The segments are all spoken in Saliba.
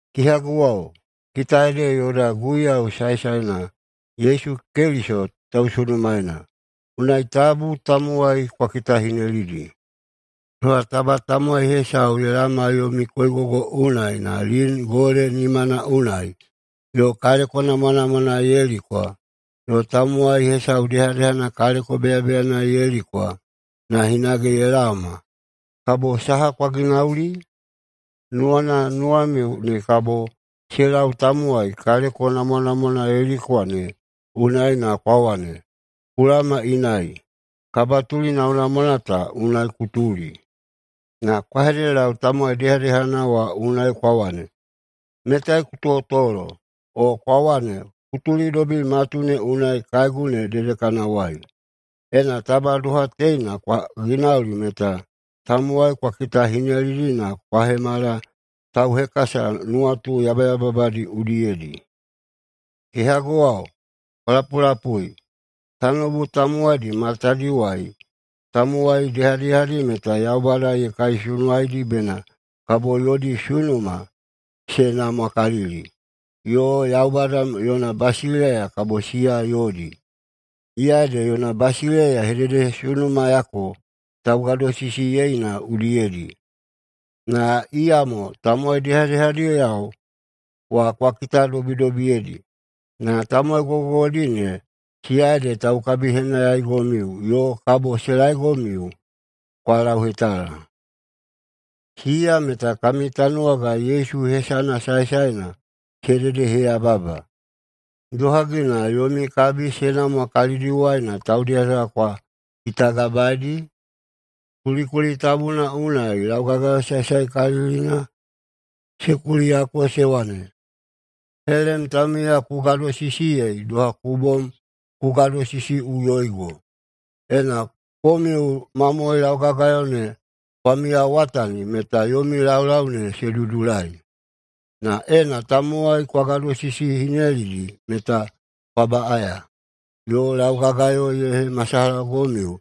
Kehaguwao, kita ede yoda Guiyau saesaena Yesu Keliso tausunumaena, unai tabu tamowai kwa kitakitahinelidi. Doha taba tamowai hesau ye laoma yomi koigogo unai na lin gole nimana unai yo kaleko namwanamwana ye likwa, yo tamowai hesau dehadehana kaleko beyabeyana ye likwa na hinage ye laoma, kabo saha kwa ginauli? Nuwana nuwamiu ne kabo se lau tamowai kaleko namwanamwana ye likwa ne unai na kwa wane, “Ku laoma inai, kabatuli namwanamwana ta unai ku tuli”. Na kwa hededelau tamowai dehadehana wa unai kwa wane, “Metai ku totolo”, o kwa wane, “Ku tulidobi matu ne unai kaegu ne dedekanawai.” Ena taba doha teina kwa ginauli meta tamowai kwa kitahinelidi na kwa hemala tauhekasa nuwatu yabayababadi udiyedi. Kehaguwao, kwa lapulapui: Tanoubu tamowaidi matadiwai tamowai dehadehadi meta Yaubada ye kaisunuwaidi bena kabo yodi sunuma se namwakalili, yo Yaubada yona basileiya kabo siya yodi, iya ede yona basileiya ye hededehesunumayako taugadosisiyeina udiyedi. Na iyamo tamowai dehadehadiyao wa kwa hedededobidobiyeidi. Na tamowai gogogogodi ne, siya ede taukabihenayaigomiu yo kabo se laegomiu kwa lauhetala. Siya meta kami tanuwaga Yesu hesana saesaena se hededeheyababa. [Idohagi na yomi kabi se namwa kalidiwai na taudehadeha kwa kitagabaeidi?] Kulikuli tabuna unai laugagayo saesaekalilina se kuliyako se wane, “Helem taumiya ku gadosisiyei doha ku bom ku gadosisiꞌuyoigo.” Ena komiu mamohoi laugagayo ne kwa miyawatani meta yomi laulau ne se dudulai. Na ena tamowai kwa gadosisihinelidi meta kwa baꞌaya, yo laugagayo ye hemasalahagomiu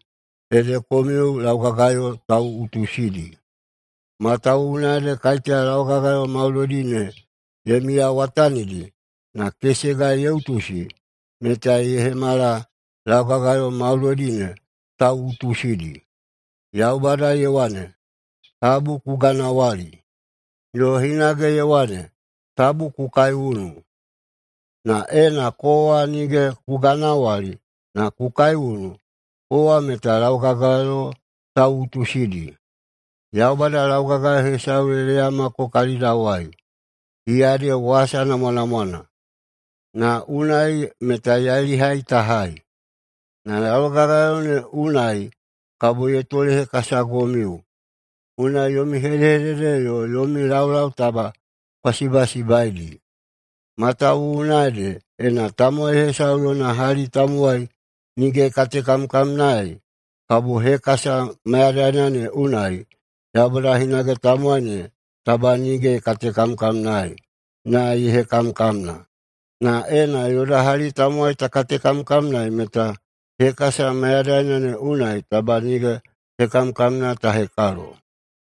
ede komiu laugagayo tauꞌutusidi. Matawuwuna ede kaiteya laugagayo maudoidi ne ye miyawatanidi, na kesega ye utusi, meta ye hemala laugagayo maudoidi ne tauꞌutusidi. Yaubada ye wane, “Tabu ku ganawali”, yo hinage ye wane, “Tabu ku kaiunu”. Na ena kowa nige ku ganawali, na ku kaiunu, kowa meta laugagayo tauꞌutusidi. Yaubada laugagayo hesau ye leyamako kalidawai, [iya ede wasa namwanamwana,] na unai meta yailihai ta hai. Na laugagayona ne unai kabo ye tolehekasagomiu, unai yomi hedehedede yo yomi laulau taba kwa sibasibaidi. Matawuwuna ede, ena tamowai hesau yona hali tamowai nige ye katekamkamnaei, kabo hekasa mayadaina ne unai Yaubada hinage tamowai ne taba nige ye katekamkamnaei, [na ye hekamkamna]. Na ena yoda hali tamowai ta katekamkamnaei, meta hekasa mayadaina ne unai taba nige hekamkamna ta hekalo.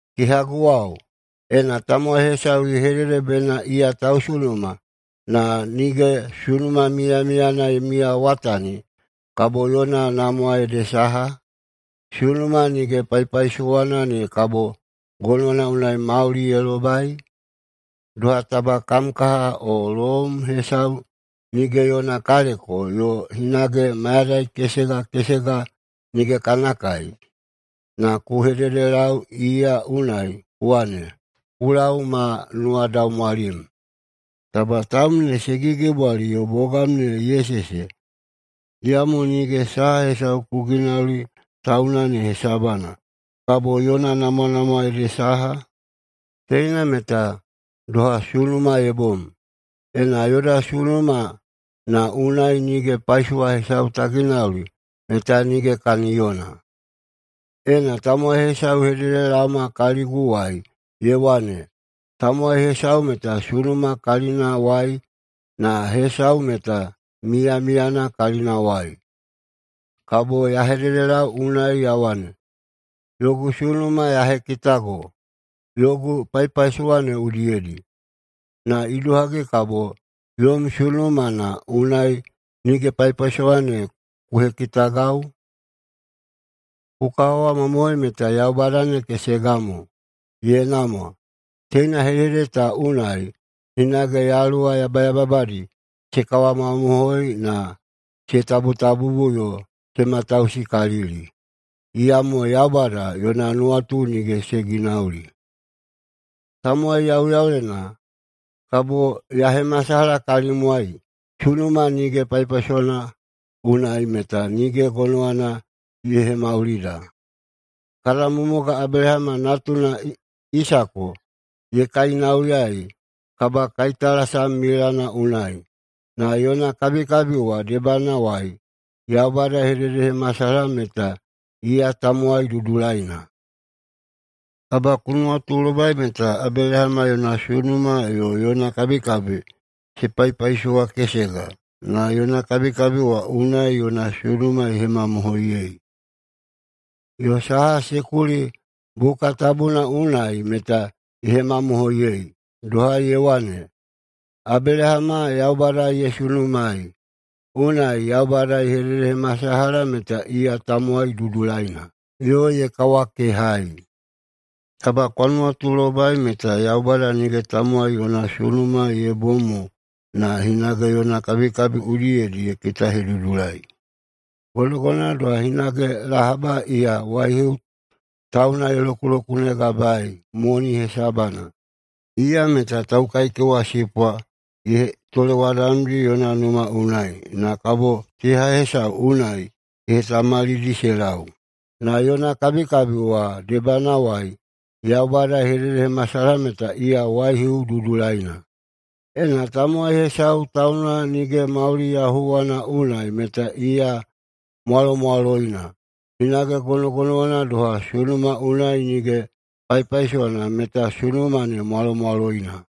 Kehaguwao, ena tamowai hesau ye hedede bena iya tausunuma, na nige sunuma miyamiyana ye miyawatani, kabo yona namwa ede saha? Sunuma nige paipaisowana ne kabo gonowana unai mauli ye lobai? Doha taba kam kaha o loum hesau nige yona kaleko yo hinage mayadai kesega kesega nige kana kai, na ku hededelau iya unai ku wane, “Ku lau ma nuwadaumwalim! Taba taum ne se gigibwali yo bogam ne ye sese!”, iyamo nige saha hesau ku ginauli tauna ne hesabana, kabo yona namwanamwa ede saha? Teina meta doha sunuma ye bom. Ena yoda sunuma na unai nige paisowana hesau ta ginauli, meta nige kaniyona. Ena tamowai hesau ye hededelaoma kaliguwai ye wane, “Tamowai hesau meta sunuma kalinawai, na hesau meta miyamiyana kalinawai,” kabo ya hededelau unai ya wane, “Yogu sunuma ya hekitago yogu paipaisowa ne udiyedi. Na idohagi kabo yom sunuma na unai nige paipaisowana ne ku hekitagau?” Ku kawamamohoi meta Yaubada ne kesega mo. Ye namwa! Teina hedehedede ta unai hinage yaluwa yabayababadi se kawamamohoi, na se tabutabubu yo se matausikalili. [Iyamo Yaubada yona nuwatu nige se ginauli.] Tamowai yauyaulena, kabo ya hemasalaha kalimwai sunuma nige paipaisowana unai meta nige gonowana ye hemaulida. Kada mumuga Abelahama natuna Isako ye kainauyaei kabakaitalasam milana unai, na yona kabikabi wa debanawai Yaubada ye hededehemasalaha meta iya tamowai dudulaina. Taba ku nuwatulobai meta Abelahama yona sunuma yo yona kabikabi se paipaisowakesega, na yona kabikabi wa unai yona sunuma ye hemamohoiyei. Yo saha se kuli buka tabuna unai meta ye hemamohoiyei, doha ye wane, “Abelahama Yaubada ye sunumaei, unai Yaubada ye hededehemasalaha meta iya tamowai dudulaina,” yo ye kawakehaei. Taba kwa nuwatulobai meta Yaubada nige tamowai yona sunuma ye bom mo na hinage yona kabikabi udiyedi ye kitahedudulai. Gonogonowana doha hinage Lahaba, iya waihiu tauna ye lokulokunegabaei moni hesabana. Iya meta taukaikewasipwa ye tolewadamdi yona numa unai, na kabo teha hesau unai ye hetamalidi se lau. Na yona kabikabi wa debanawai Yaubada ye hededehemasalaha meta iya waihiu dudulaina. Ena tamowai hesau tauna nige mauli yahuwana unai meta iya mwalomwaloina, hinage gonogonowana doha sunuma unai nige paipaisowana meta sunuma ne mwalomwaloina.